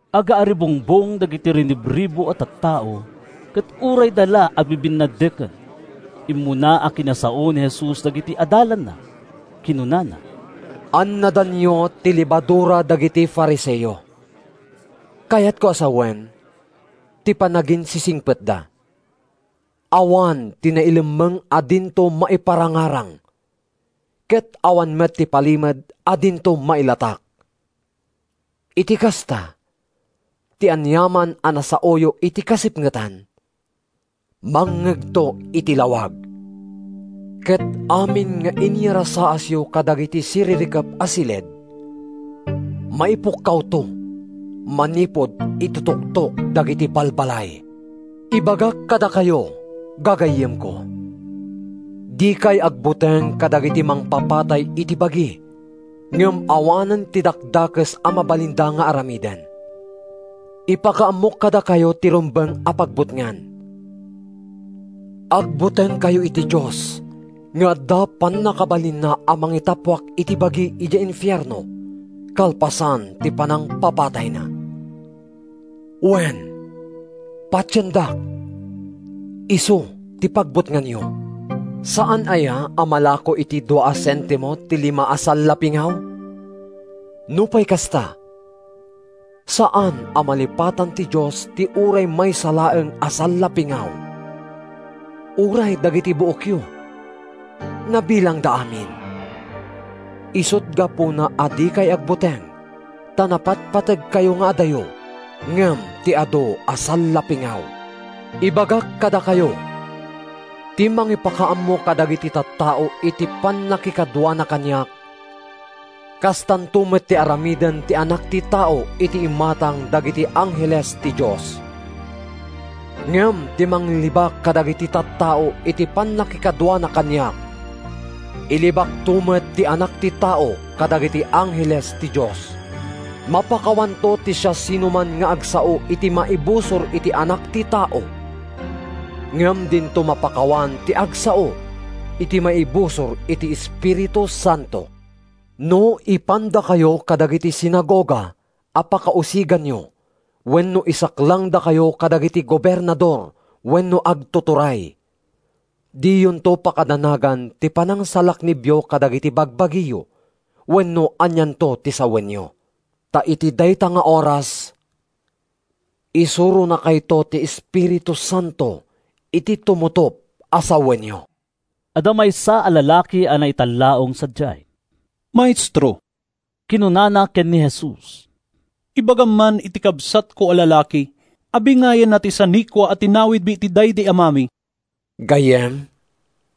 Agaaribungbong dagiti rinibribu a tattao ket urayda la agbibinnaddeken. Immuna a kinasao ni Jesus dagiti adalanna. Kinunana “Annadanyo ti lebadura dagiti Fariseo, kayatko a sawen, ti panaginsisingpetda. Awan ti nailemmeng a dinto maiparangarang, ket awan met ti palimed a dinto mailatak. Iti kasta, ti aniaman a nasaoyo iti kasipngetan, mangngegto iti lawag. Ket amin nga inyarasaasyo kadagiti siririkep a siled, maipukkawto manipud iti tuktok dagiti balbalay.” “Ibagak kadakayo, gagayyemko: Dikay agbuteng kadagiti mangpapatay iti bagi ngem awanen ti dakdakes a mabalinda nga aramiden. Ipakaammok kadakayo ti rumbeng a pagbutngan: Agbutengkayo iti Dios nga adda pannakabalinna a mangitappuak iti bagi idiay infierno kalpasan ti panangpapatayna. Wen, patiendak, isu ti pagbutnganyo! “Saan aya a malako iti dua a sentimo ti lima a sallapingaw? Nupay kasta, saan a malipatan ti Dios ti uray maysa laeng a sallapingaw. Uray dagiti buokyo, nabilangda amin. Isut’ gapuna a dikay agbuteng ta napatpategkayo nga adayo ngem ti adu a sallapingaw.” “Ibagak kadakayo: Ti mangipakaammo kadagiti tattao iti pannakikaduana kaniak, kastanto met ti aramiden ti Anak ti Tao iti imatang dagiti angheles ti Dios. Ngem ti mangilibak kadagiti tattao iti pannakikaduana kaniak, ilibakto met ti Anak ti Tao kadagiti angheles ti Dios. “Mapakawanto ti siasinoman nga agsao iti maibusor iti Anak ti Tao. Ngem dinto mapakawan ti agsao iti maibusor iti Espiritu Santo. “No ipandakayo kadagiti sinagoga a pakausiganyo wenno isaklangdakayo kadagiti gobernador wenno agtuturay, diyonto pakadanagan ti panangsalaknibyo kadagiti bagbagiyo wenno anianto ti sawenyo. Ta iti dayta nga oras, isuronakayto ti Espiritu Santo iti tumutop a sawenyo.” Adda maysa a lalaki a naitallaong sadiay. “Maestro,” kinunana ken ni Jesus, “ibagam man iti kabsatko a lalaki a bingayenna ti sanikua a tinawidmi iti daydi amami.” “Gayyem,”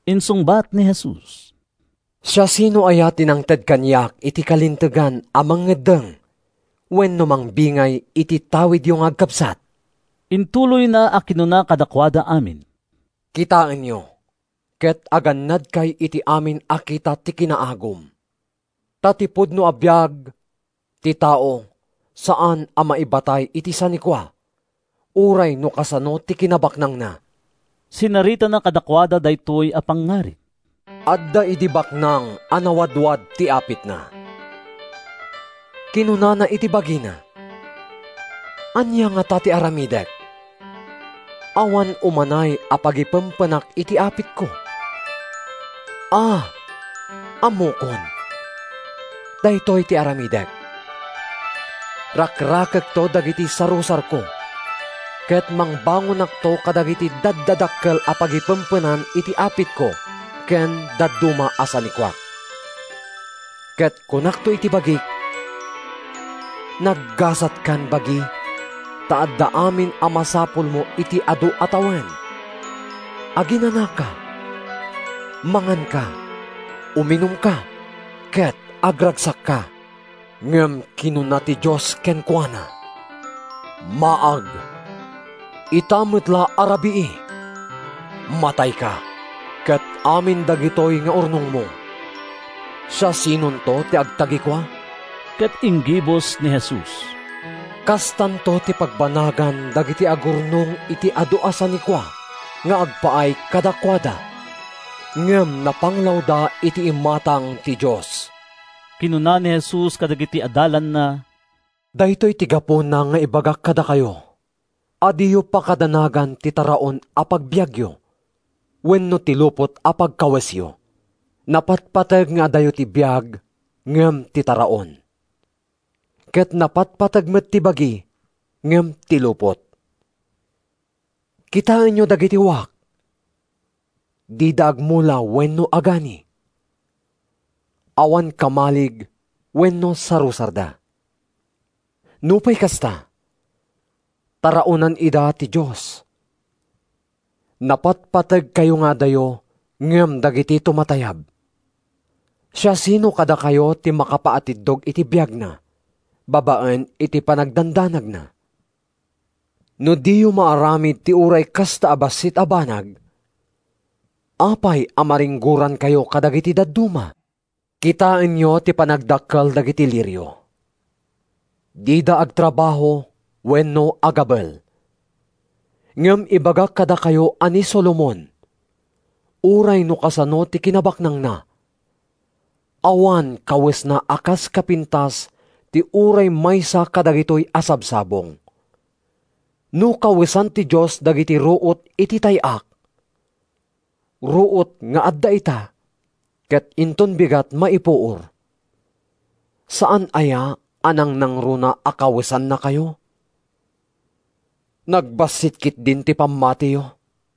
insungbat ni Jesus, “siasino aya ti nangted kaniak iti kalintegan a mangeddeng wenno mangbingay iti tawidyo nga agkabsat?” Intuloyna a kinuna kadakuada amin: “Kitaenyo ket agannadkay iti amin a kita ti kinaagum. Ta ti pudno a biag ti tao saan a maibatay iti sanikua, uray no kasano ti kinabaknangna.” Sinaritana kadakuada daytoy a pangngarig, “Adda idi baknang a nawadwad ti apitna. Kinunana iti bagina: ‘Ania ngata ti aramidek? Awan umanay a pagipempenak iti apitko. A, ammokon! Daytoy ti aramidek: Rakrakekto dagiti sarusarko, ket mangbangonakto kadagiti daddadakkel a pagipempenan iti apitko ken dadduma a sanikuak. Ket kunakto iti bagik: ‘Naggasatkan, bagi, ta adda amin a masapulmo iti adu a tawen. Aginanaka, manganka, uminumka, ket agragsakka.’ Ngem kinuna ti Dios kenkuana: ‘Maag! Ita met la a rabii, matayka. Ket amin dagitoy nga urnongmo, siasinonto ti agtagikua?’” Ket inggibus ni Jesus, “Kastanto ti pagbanagan dagiti agurnong iti adu a sanikua nga agpaay kadakuada, ngem napanglawda iti imatang ti Dios.” Kinuna ni Jesus kadagiti adalanna, “Daytoy ti gapuna nga ibagak kadakayo a diyo pakadanagan ti taraon a pagbiagyo wenno ti lupot a pagkawesyo. Napatpateg nga adayo ti biag ngem ti taraon, ket napatpateg met ti bagi ngem ti lupot. Kitaenyo dagiti wak. Dida agmula wenno agani. Awan kamalig wenno sarusarda. Nupay kasta, taraonan ida ti Dios. Napatpategkayo nga adayo ngem dagiti tumatayab! “Siasino kadakayo ti makapaatiddog iti biagna babaen iti panagdandanagna? No diyo maaramid ti uray kasta a bassit a banag, apay a maringgorankayo kadagiti dadduma? Kitaenyo ti panagdakkel dagiti lirio. Dida agtrabaho wenno agabel. Ngem ibagak kadakayo a ni Solomon, uray no kasano ti kinabaknangna, awan kawesna a kas kapintas ti uray maysa kadagitoy a sabsabong. No kawesan ti Dios dagiti ruot iti tay-ak, ruot nga adda ita ket inton bigat maipuor, saan aya a nangnangruna a kawesannakayo? Nagbassit ketdin ti pammatiyo!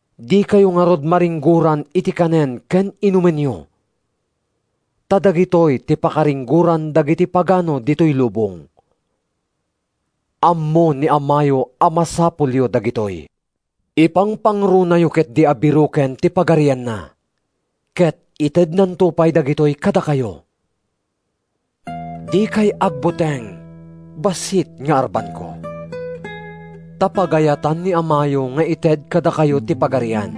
Dikayo ngarud maringgoran iti kanen ken inumenyo. Ta dagitoy ti pakaringgoran dagiti pagano ditoy lubong. Ammo ni Amayo a masapulyo dagitoy. Ipangpangrunayo ketdi a biroken ti Pagarianna, ket itednanto pay dagitoy kadakayo.” “Dikay agbuteng, bassit nga arbanko! Ta pagayatan ni Amayo nga ited kadakayo ti Pagarian.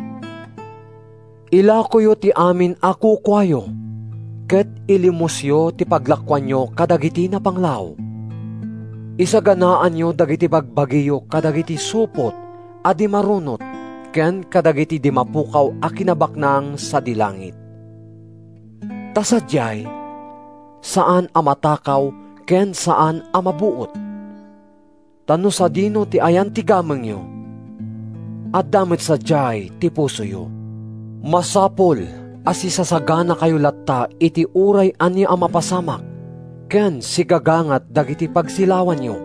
Ilakoyo ti amin a kukuayo ket ilimosyo ti paglakoanyo kadagiti napanglaw. Isaganaanyo dagiti bagbagiyo kadagiti supot a di marunot ken kadagiti di mapukaw a kinabaknang sadi langit. Ta sadiay saan a matakaw ken saan a mabuot. Ta no sadino ti ayan ti gamengyo, adda met sadiay ti pusoyo.” “Masapul a sisasaganakayo latta iti uray ania a mapasamak ken sigagangat dagiti pagsilawanyo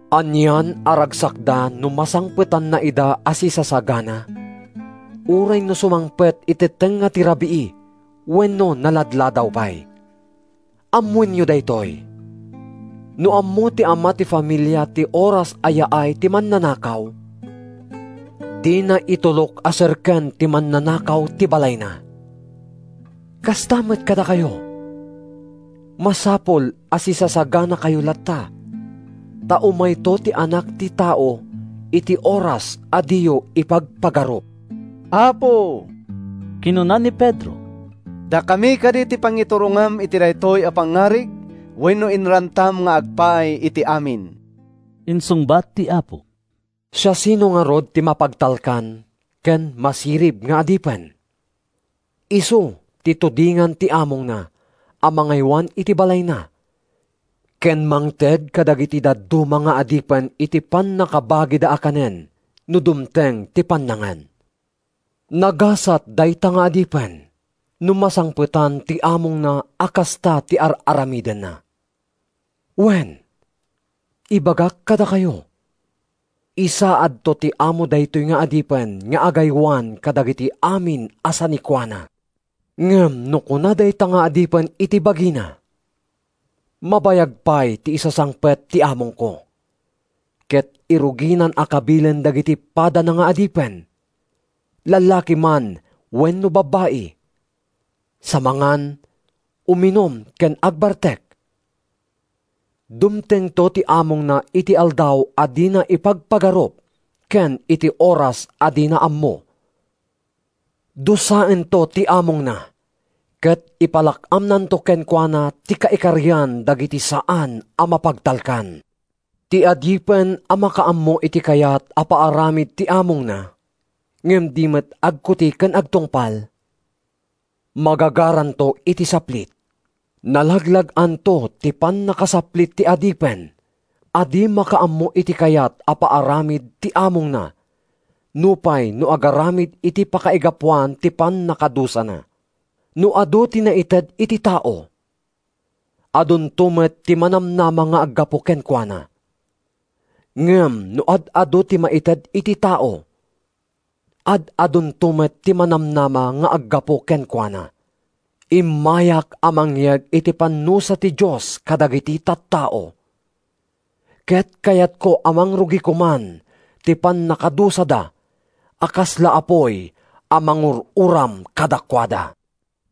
Anian a ragsakda no masangpetanna ida a sisasagana, uray no sumangpet iti tengnga ti rabii wenno naladladaw pay. Ammoenyo daytoy: No ammo ti ama ti familia ti oras a yaay ti mannanakaw, dina itulok a serken ti mannanakaw ti balayna. Kasta met kadakayo, masapul a sisasaganakayo latta, ta umayto ti Anak ti Tao iti oras a diyo ipagpagarup.” “Apo,” kinuna ni Pedro, “dakami kadi ti pangiturongam iti daytoy a pangngarig wenno inrantam nga agpaay iti amin?” Insungbat ti Apo, “Siasino ngarud ti mapagtalkan ken masirib nga adipen? Isu ti tudingan ti amongna a mangaywan iti balayna ken mangted kadagiti dadduma nga adipen iti pannakabagida a kanen no dumteng ti pannangan. Nagasat dayta nga adipen no masangpetan ti amongna a kasta ti ar-aramidenna! Wen, ibagak kadakayo, isaadto ti amo daytoy nga adipen nga agaywan kadagiti amin a sanikuana. Ngem no kuna dayta nga adipen iti bagina, ‘Mabayag pay ti isasangpet ti amongko,’ ket iruginan a kabilen dagiti padana nga adipen, lallaki man wenno babbai, sa mangan, uminum ken agbartek. Dumtengto ti amongna iti aldaw a dina ipagpagarup ken iti oras a dina ammo. Dusaento ti amongna ket ipalak-amnanto kenkuana ti kaikarian dagiti saan a mapagtalkan. “Ti adipen a makaammo iti kayat a paaramid ti amongna ngem di met agkuti ken agtungpal, magagaranto iti saplit. Nalaglag-anto ti pannakasaplit ti adipen a di makaammo iti kayat a paaramid ti amongna nupay no agaramid iti pakaigapuan ti pannakadusana. “No adu ti naited iti tao, adunto met ti manamnama nga aggapu kenkuana. Ngem no ad-adu ti maited iti tao, ad-adunto met ti manamnama nga aggapu kenkuana.” “Immayak a mangyeg iti pannusa ti Dios kadagiti tattao, ket kayatko a mangrugi koman ti pannakadusada a kasla apuy a mangur-uram kadakuada.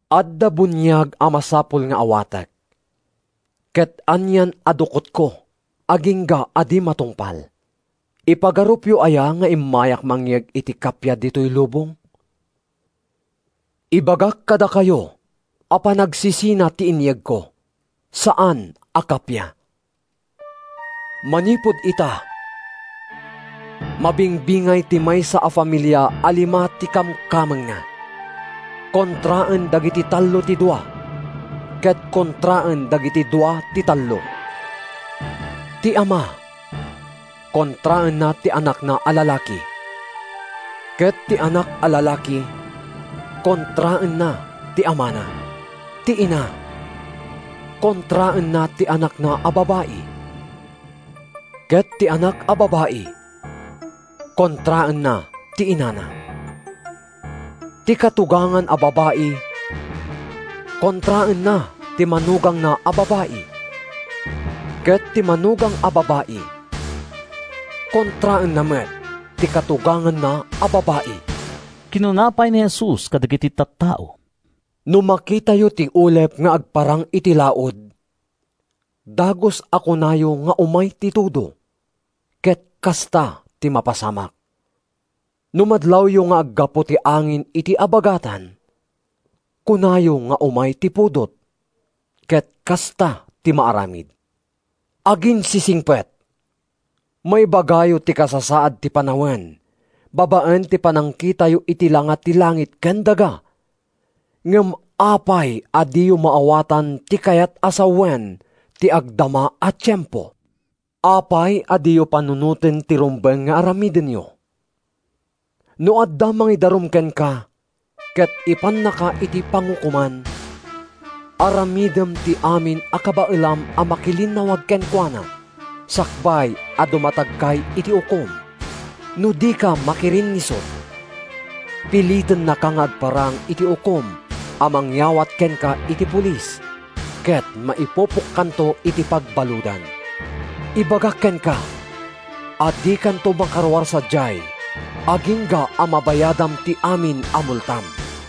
Adda buniag a masapul nga awatek, ket anian a dukotko agingga a di matungpal. “Ipagarupyo aya nga immayak mangyeg iti kappia ditoy lubong? Ibagak kadakayo a panagsisina ti inyegko, saan a kappia. Manipud ita, mabingbingay ti maysa a familia a lima ti kamkamengna. Kontraen dagiti tallo ti dua, ket kontraen dagiti dua ti tallo. Ti ama kontraenna ti anakna a lalaki, ket ti anak a lalaki kontraenna ti amana. Ti ina kontraenna ti anakna a babai, ket ti anak a babai kontraenna ti inana. Ti katugangan a babai kontraenna ti manugangna a babai, ket ti manugang a babai kontraenna met ti katuganganna a babai.” Kinuna pay ni Jesus kadagiti tattao, “No makitayo ti ulep nga agparang iti laud, dagus a kunayo nga umay ti tudo, ket kasta ti mapasamak. No madlawyo nga aggapu ti angin iti abagatan, kunayo nga umay ti pudot; ket kasta ti maaramid. Aginsisingpet! Maibagayo ti kasasaad ti panawen babaen ti panangkitayo iti langa ti langit ken daga, ngem apay a diyo maawatan ti kayat a sawen ti agdama a tiempo?” “Apay a diyo panunoten ti rumbeng nga aramidenyo? No adda mangidarum kenka ket ipannaka iti pangukoman, aramidem ti amin a kabaelam a makilinnawag kenkuana sakbay a dumatagkay iti ukom. No dika makirinnisut, pilitennaka nga agparang iti ukom a mangyawat kenka iti polis, ket maipupokkanto iti pagbaludan. Ibagak kenka a dikanto makaruar sadiay agingga a mabayadam ti amin a multam.”